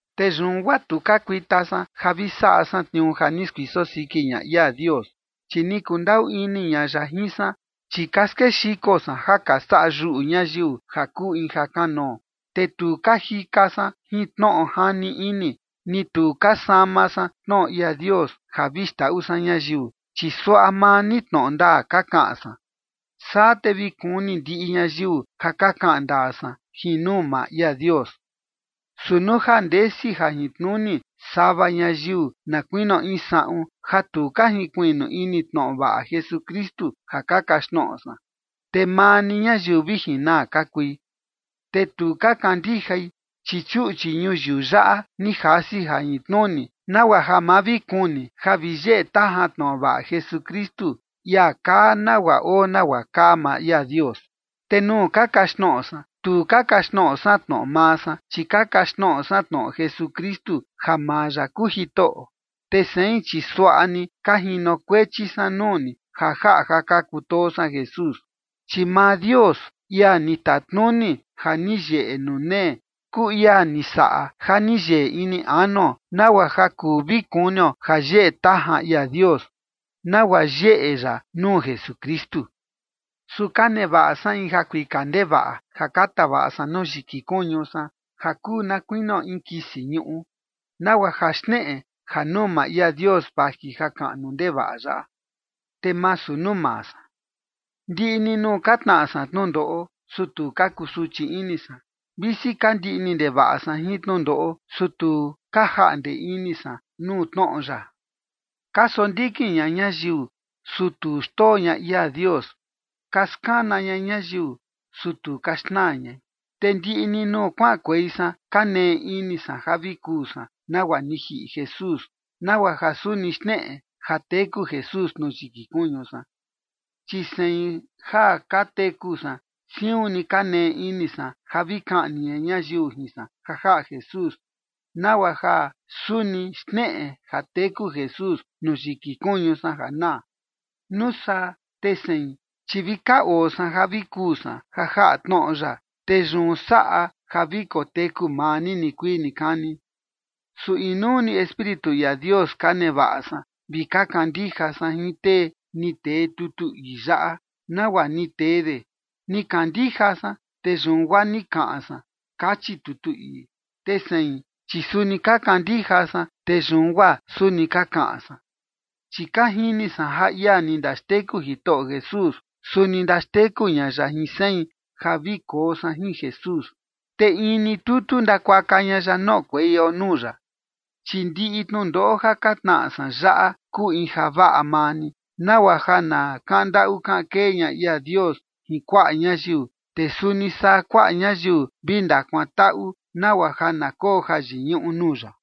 Te yun guaa tu ka kuita san ja vi saꞌa san tniuu ja ni skuiso siki ña ia Dios, chi ni kundaꞌu ini ña ya jin san. Chi ka skexiko san ja ka saꞌa yuꞌu ñayiu ja kuu in jakanoo, te tu ka jika san jin tnoꞌo jani ini, ni tu ka sama san tnoꞌo ia Dios ja vi xndaꞌu san ñayiu. Chi suaꞌa maa ni tnoꞌo ndaa ka kaꞌan san, saa te vi kuni ndiꞌi ñayiu ja ka kaꞌan ndaa san jin nuu maa ia Dios. Su nuu ja ndesi jajintnuni sava ñayiu na kuinio in saꞌun, ja tu ka jinkuiꞌnu ini tnoꞌo vaꞌa Jesukristu ja ka kaxtnoꞌo san, te maa ni ñayiu vi jinaa ka kui. Te tu ka kandijai, chi chuꞌchi ñuyiu yaꞌa ni jasi jajintnuni, nagua ja ma vi kuni ja vi yeꞌe tajan tnoꞌo vaꞌa Jesukristu, ia kaa nagua oo nagua kaa maa ia Dios. Te nuu ka kaxtnoꞌo san, tu ka kaxtnoꞌo san tnoꞌo maa san, chi ka kaxtnoꞌo san tnoꞌo Jesukristu ja maa ya kuu Jitoꞌo. Te sein, chi suaꞌa ni ka jinokuechi san nuu ni, ja jaꞌa ja ka kutoo san Jesús. Chi maa Dios, ia ni tatnuni ja ni yeꞌe nuu nee, kuu ia ni saꞌa ja ni yeꞌe ini anuo nagua ja kuu vi kunio jayeꞌe tajan ia Dios, nagua yeꞌe ya nuu Jesukristu. Su ka nevaꞌa san in jakuika ndevaꞌa ja ka tavaꞌa san nuu yiki kuñu san ja kuu na kuinio in kisi ñuꞌu, nagua ja xneꞌe ja nuu maa ia Dios vaji jakaꞌnu ndevaꞌa yaꞌa, te masu nuu maa san. Ndiꞌi ni nuu ka tnaꞌa san tnundoꞌo, su tu ka kusuchi ini san. Visi ka ndiꞌni ndevaꞌa san jin tnundoꞌo, su tu ka jaꞌnde ini san nuu tnoꞌo ya. Ka sondikin ña ñayiu, su tu xndoo ña ia Dios. Ka skana ña ñayiu, su tu ka xnaa ñai. Te ndiꞌi ni nuu kuaꞌankuei san, ka nee ini san ja vi kuu san nagua ni jiꞌi Jesús, nagua ja suni xneꞌe ja teku Jesús nuu yiki kuñu san. Chi sein ja ka teku san siun ni ka nee ini san ja vi kaꞌni ña ñayiu jin san ja jaꞌa Jesús, nagua ja suni xneꞌe ja teku Jesús nuu yiki kuñu san ja naa. Nuu saa te sein, chi vi ka oo san ja vi kuu san ja jaꞌa tnoꞌo ya, te yun saꞌa ja vi koteku maa ni nikuii nikani. Su inuu ni Espíritu ia Dios ka nevaꞌa san vi ka kandija san jin tee ni tee tutu ii yaꞌa nagua ni tee de: “Ni kandija san, te yun guaa ni kaꞌan san”, kachi tutu ii. Te sein, chi suni ka kandija san, te yun guaa suni ka kaꞌan san. Chi ka jini san ja ia ni ndaxteku Jitoꞌo Jesús, suni ndaxteku ña ya jin sein ja vi koo san jin Jesús, te in ni tutu ndakuaka ña ya noꞌokueio nuu ya. Chi ndiꞌi tnundoꞌo ja ka tnaꞌa san yaꞌa kuu in javaꞌa maa ni, nagua ja na kaꞌan ndaꞌu kaꞌan kee ña ia Dios jin kuaꞌa ñayiu. Te suni saa kuaꞌa ñayiu vi ndakuantaꞌu, nagua ja na koo jayiñuꞌu nuu ya.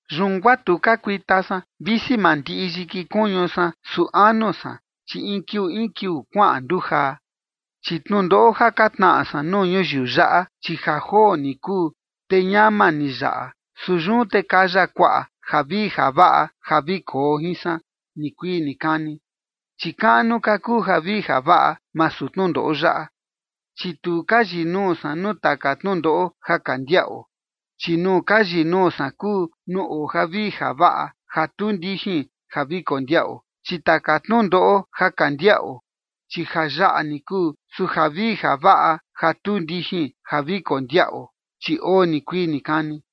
Yun guaa tu ka kuita san. Visi mandiꞌi yiki kuñu san, su anu san, chi in kiuu in kiuu kuaꞌan ndujaa. Chi tnundoꞌo ja ka tnaꞌa san nuu ñuyiu yaꞌa, chi ja joo ni kuu, te ñama ni yaꞌa. Su yun te kaya kuaꞌa javii javaꞌa ja vi koo jin san nikuii nikani, chi kaꞌnu ka kuu javii javaꞌa masu tnundoꞌo yaꞌa. Chi tu ka yinuu san nuu taka tnundoꞌo ja ka ndiaꞌo, chi nuu ka yinuu san kuu nuu oo javii javaꞌa ja tu ndijin ja vi kondiaꞌo. Chi taka tnundoꞌo ja ka ndiaꞌo, chi ja yaꞌa ni kuu, su javii javaꞌa ja tu ndijin ja vi kondiaꞌo, chi oo nikuii nikani.